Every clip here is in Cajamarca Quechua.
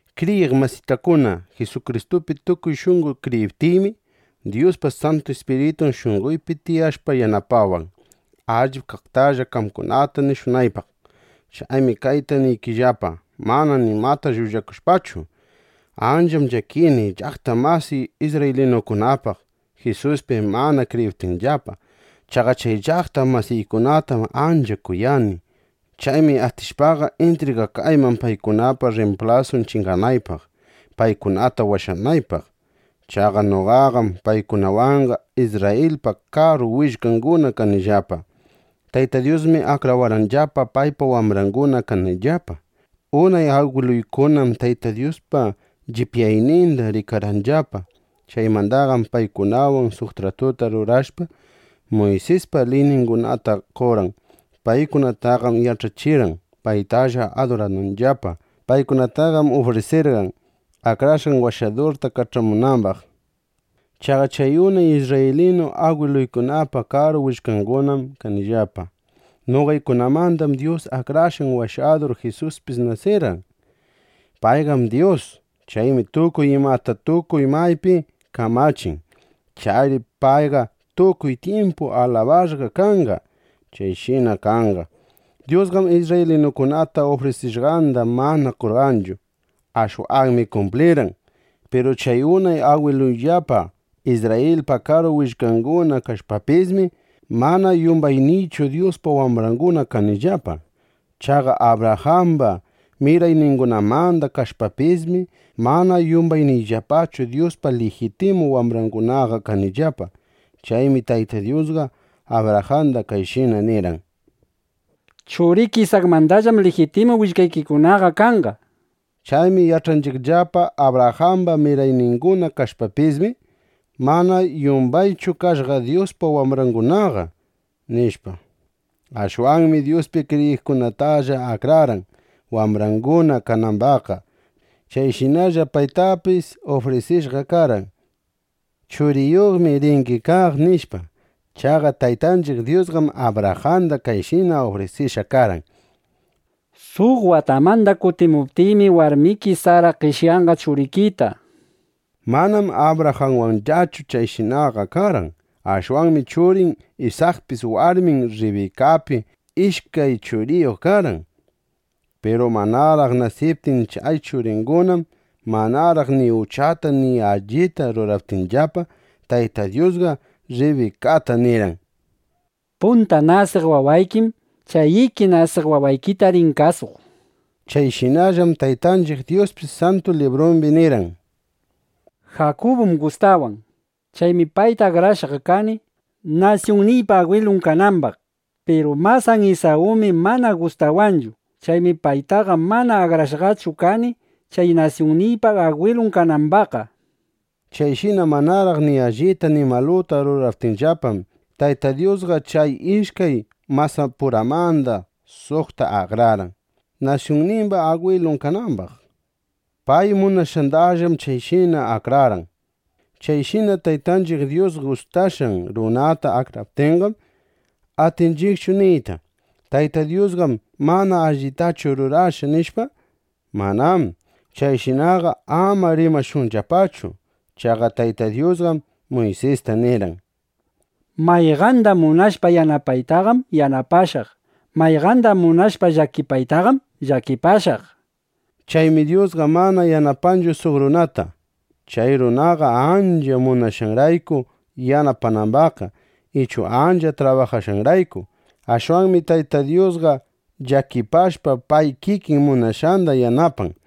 Kriyiq masitakuna, Jisukristupi tukuy shunqo kriyiptiymi, Dyuspa Santu Ispiritun shunqoypi tiyashpa yanapawan, allip kaqtalla qamkunata nishunaypaq. Chaymi kayta niykillapa, mana nimata llullakushpachu: Ancham llakini (llaqta masiy isrraylinukunapaq, Jisuspi mana kriyiptinllapa. Chaqa chay llaqta masiykunatam ancha kuyani.) Chaymi atishpaqa, intrigakayman paykunapa rrimplasun chinganaypaq, paykunata washanaypaq. Chaqa noqaqam paykunawanqa Isrrayilpa karu willkanguna kanillapa. Tayta Dyusmi akrawarqanllapa, paypa wambranguna kanayllapa. Unay agwiluykunam Tayta Dyuspa llipyayninda rikarqanllapa. Chaymandaqam paykunawan suq tratuta rurashpa, Muysispa liyningunata qorqan. Paykunataqam yach'achirqan, paytalla adurananllapa. Paykunataqam ufrisirqan, Akrashqan Washadurta kach'amunambaq. Chaqa chay unay isrraylinu agwiluykunapa karu willkangunam kanillapa. Noqaykunamandam Dyus Akrashqan Washadur Jisuspis nasirqan. Payqam Dyus. Chaymi tukuy imata, tukuy maypi kamachin. Chayri payqa tukuy tyimpu alabashqa kanqa. ¡Chayshina kanqa! Dyusqam isrraylinukunata ufrisishqanda mana qonqarqanchu. (Ashwanmi kumplirqan.) Piru chay unay agwiluyllapa Isrrayilpa karu willkanguna kashpapismi, mana yumbayniychu Dyuspa wambranguna kanillapa. Chaqa Abrajamba mirayningunamanda kashpapismi, mana yumbayniyllapachu Dyuspa lijitimu wambrangunaqa kanillapa. Chaymi Tayta Dyusqa Abrajanda kayshina nirqan: “Churiki Isakmandallam lijitimu willkaykikunaqa kanqa”, nishpa. Chaymi yach'anchiqllapa: Abrajamba mirayninguna kashpapismi, mana yumbaychu kashqa Dyuspa wambrangunaqa, nishpa. Ashwanmi Dyuspi kriyiqkunatalla akrarqan, wambranguna kanambaqqa. Chayshina Abrajan Dyuspi kriyiptinmi, chayshinalla paytapis ufrisishqa karqan: Churiyuqmi ringi kaq, nishpa. Chaqa Taytanchiq Dyusqam Abrajanda kayshina ufrisishqa karqan: “Suq watamanda kutimuptiymi, warmiki Sara qeshyanqa churikita”, nishpa. Manam Abrajanwanllachu chayshinaqa karqan. Ashwanmi churin Isakpis warmin Rribikapi ishkay churiyuq karqan. Piru manaraq nasiptin chay churingunam, manaraq ni uchata ni allita ruraptinllapa, Tayta Dyusqa Rribikata nirqan: “Punta nasiq wawaykim chay iki nasiq wawaykita rin kasuq”, nishpa. Chayshinallam Taytanchiq Dyuspis Santu Librumbi nirqan: “Jakubum gustawan. (Chaymi payta akrashqa kani, nasyunniypa agwilun kanambaq.) Piru masan Isawmi mana gustawanchu. (Chaymi paytaqa mana akrashqachu kani chay nasyunniypa agwilun kanambaqqa)”, nishpa. Chayshina manaraq ni allita ni maluta ruraptinllapam, Tayta Dyusqa chay ishkay masapuramanda suqta akrarqan, nasyunnimba agwilun kanambaq. Pay munashqandallam chayshinaqa akrarqan. Chayshina Taytanchiq Dyus gustashqan runata akraptinqam, ¿atinchiqchu niyta: “Tayta Dyusqam mana allitachu rurashqa”, nishpa? ¡Manám! Chayshinaqa ama rimashunllapachu. Chaqa Tayta Dyusqam Muysista nirqan: “Mayqanda munashpa yanapaytaqam, yanapashaq. Mayqanda munashpa llakipaytaqam, llakipashaq”, nishpa. Chaymi Dyusqa mana yanapanchu suq runata, chay runaqa ancha munashqanrayku yanapanambaqqa ichu ancha trabajashqanrayku. Ashwanmi Tayta Dyusqa llakipashpa pay kikin munashqanda yanapan.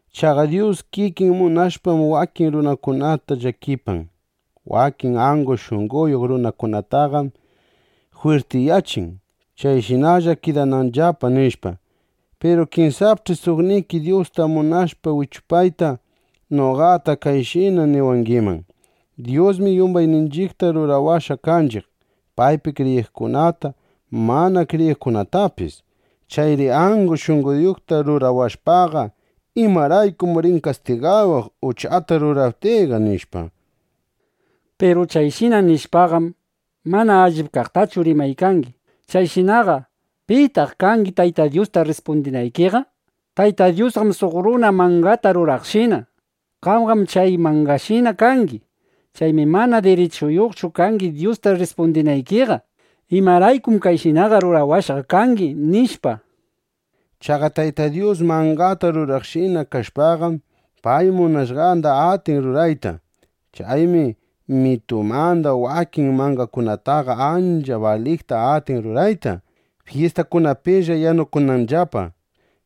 Chaqa Dyus kikin munashpam, wakin runakunata llakipan, wakin angu shunqoyuq runakunataqam jwirtiyachin, chayshinalla kidananllapa, nishpa. Piru kinsapch'i suqniki Dyusta munashpa wichupayta noqata kayshina niwangiman: “Dyusmi yumbayninchiqta rurawashqa kanchiq, paypi kriyiqkunata, mana kriyiqkunatapis. Chayri angu shunqoyuqta rurawashpaqa, ¿Imaraykum rin kastigawaq, uchata ruraptiyqa?” nishpa. (Piru chayshina nishpaqam, mana allip kaqtachu rimaykangi.) Chayshinaqa ¿pitaq kangi Tayta Dyusta rrispundinaykiqa? Tayta Dyusqam suq runa mangata ruraqshina. Qamqam chay mangashina kangi. Chaymi mana dirichuyuqchu kangi Dyusta rrispundinaykiqa: “¿Imaraykum kayshinaqa rurawashqa kangi?” nishpa. Chaqa Tayta Dyus mangata ruraqshina kashpaqam, pay munashqanda atin rurayta. Chaymi mitumanda wakin mangakunataqa ancha baliqta atin rurayta, fyistakunapilla yanukunanllapa.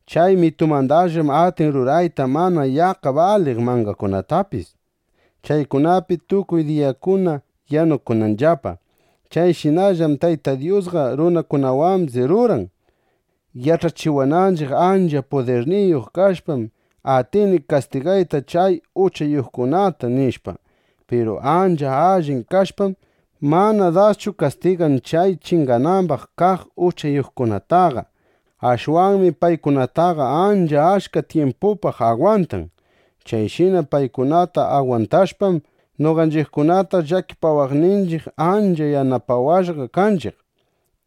Chay mitumandallam atin rurayta mana yaqqa baliq mangakunatapis, chaykunapi tukuy diyakuna yanukunanllapa. Chayshinallam Tayta Dyusqa runakunawambis ruran, yach'achiwananchiq: Ancha pudirniyuq kashpam, atini kastigayta chay uchayuqkunata, nishpa. Piru ancha allin kashpam, mana daschu kastigan chay chinganambaq kaq uchayuqkunataqa. Ashwanmi paykunataqa ancha achka tyimpupaq agwantan. Chayshina paykunata agwantashpam, noqanchiqkunata llakipawaqninchiq, ancha yanapawashqa kanchiq,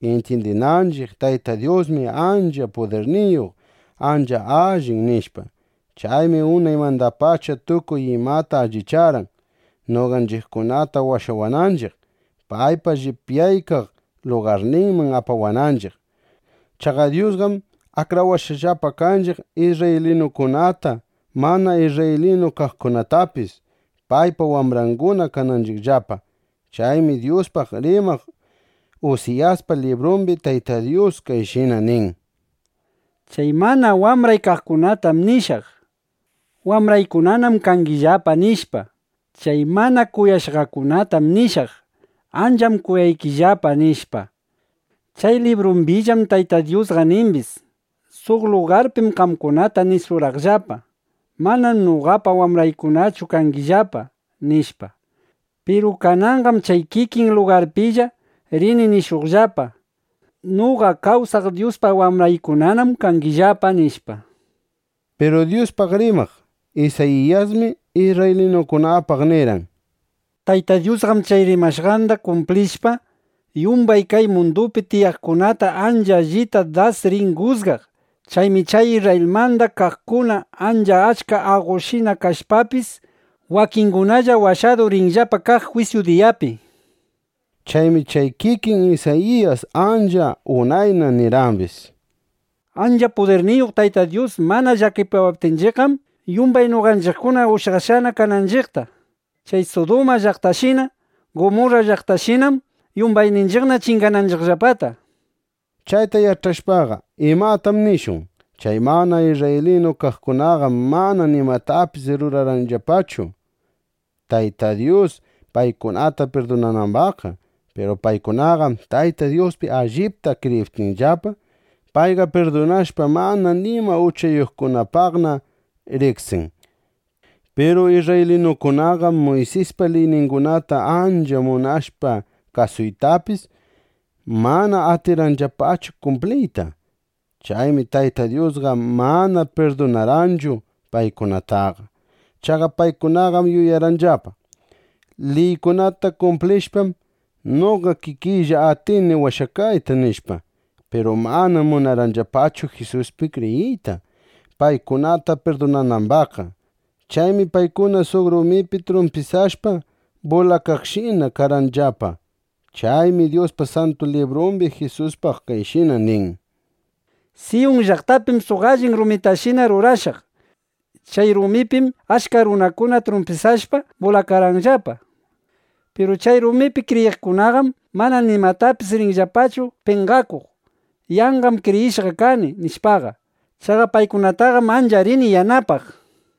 intyindinanchiq: Tayta Dyusmi ancha pudirniyuq, ancha allin, nishpa. Chaymi unaymandapacha tukuy imata allicharqan, noqanchiqkunata washawaqninchiq, paypa llipyaykaq lugarninman apawananchiq. Chaqa Dyusqam akrawashqallapa kanchiq isrraylinukunata, mana isrraylinu kaqkunatapis, paypa wambranguna kananchiqllapa. Chaymi Dyuspaq rimaq Usiyaspa librumbi Tayta Dyus kayshina nin: Chay mana wambray kaqkunatam nishaq: “Wambraykunanam kangillapa”, nishpa. Chay mana kuyashqakunatam nishaq: “Ancham kuyaykillapa”, nishpa. Chay librumbillam Tayta Dyusqa nimbis: Suq lugarpim qamkunata nishurqaqllapa: “Manam noqapa wambraykunachu kangillapa”, nishpa. Piru kananqam chay kikin lugarpilla rini nishuqllapa: “Noqa kawsaq Dyuspa wambraykunanam kangillapa”, nishpa. Piru Dyuspaq rimaq Isayiyasmi isrraylinukunapaq nirqan: “Tayta Dyusqam chay rimashqanda kumplishpa, yumbay kay mundupi tiyaqkunata ancha allita das rin jusgaq. Chaymi chay Isrrayilmanda kaqkuna, ancha achka aqoshina kashpapis, wakingunalla washadu rinllapa kaq jwisyu diyapi,” nishpa. Chaymi chay kikin Isayiyas ancha unayna nirqambis: Ancha pudirniyuq Tayta Dyus mana llakipawaptinchiqqam, yumbay noqanchiqkuna ushyakashqana kananchiqta. Chay Suduma llaqtashina, Gumurra llaqtashinam yumbayninchiqna chingananchiqllapata, nishpa. Chayta yach'ashpaqa, ¿imatam nishun? Chay mana isrraylinu kaqkunaqam mana nimatapis rurarqanllapachu, Tayta Dyus paykunata pirdunanambaqqa. Piru paykunaqam Tayta Dyuspi allipta kriyiptinllapa, payqa pirdunashpa, mana nima uchayuqkunapaqna riqsin. Piru isrraylinukunaqam Muysispa liyningunata ancha munashpa kasuytapis, mana atirqanllapachu kumpliyta. Chaymi Tayta Dyusqa mana pirdunarqanchu paykunataqa. Chaqa paykunaqam yuyarqanllapa: Liykunata kumplishpam, noqa kikiylla atini washakayta, nishpa. Piru manam munarqanllapachu Jisuspi kriyiyta, paykunata pirdunanambaqqa. Chaymi paykuna suq rumipi trumpisashpa bulakaqshina karqanllapa. Chaymi Dyuspa Santu Librumbi Jisuspaq kayshina nin: Siyun llaqtapim suq allin rumitashina rurashaq. Chay rumipim achka runakuna trumpisashpa, bulakanqallapa. Piru chay rumipi kriyiqkunaqam mana nimatapis rinllapachu penqakuq: “Yanqam kriyishqa kani”, nishpaqa. Chaqa paykunataqam ancha rini yanapaq, nishpa.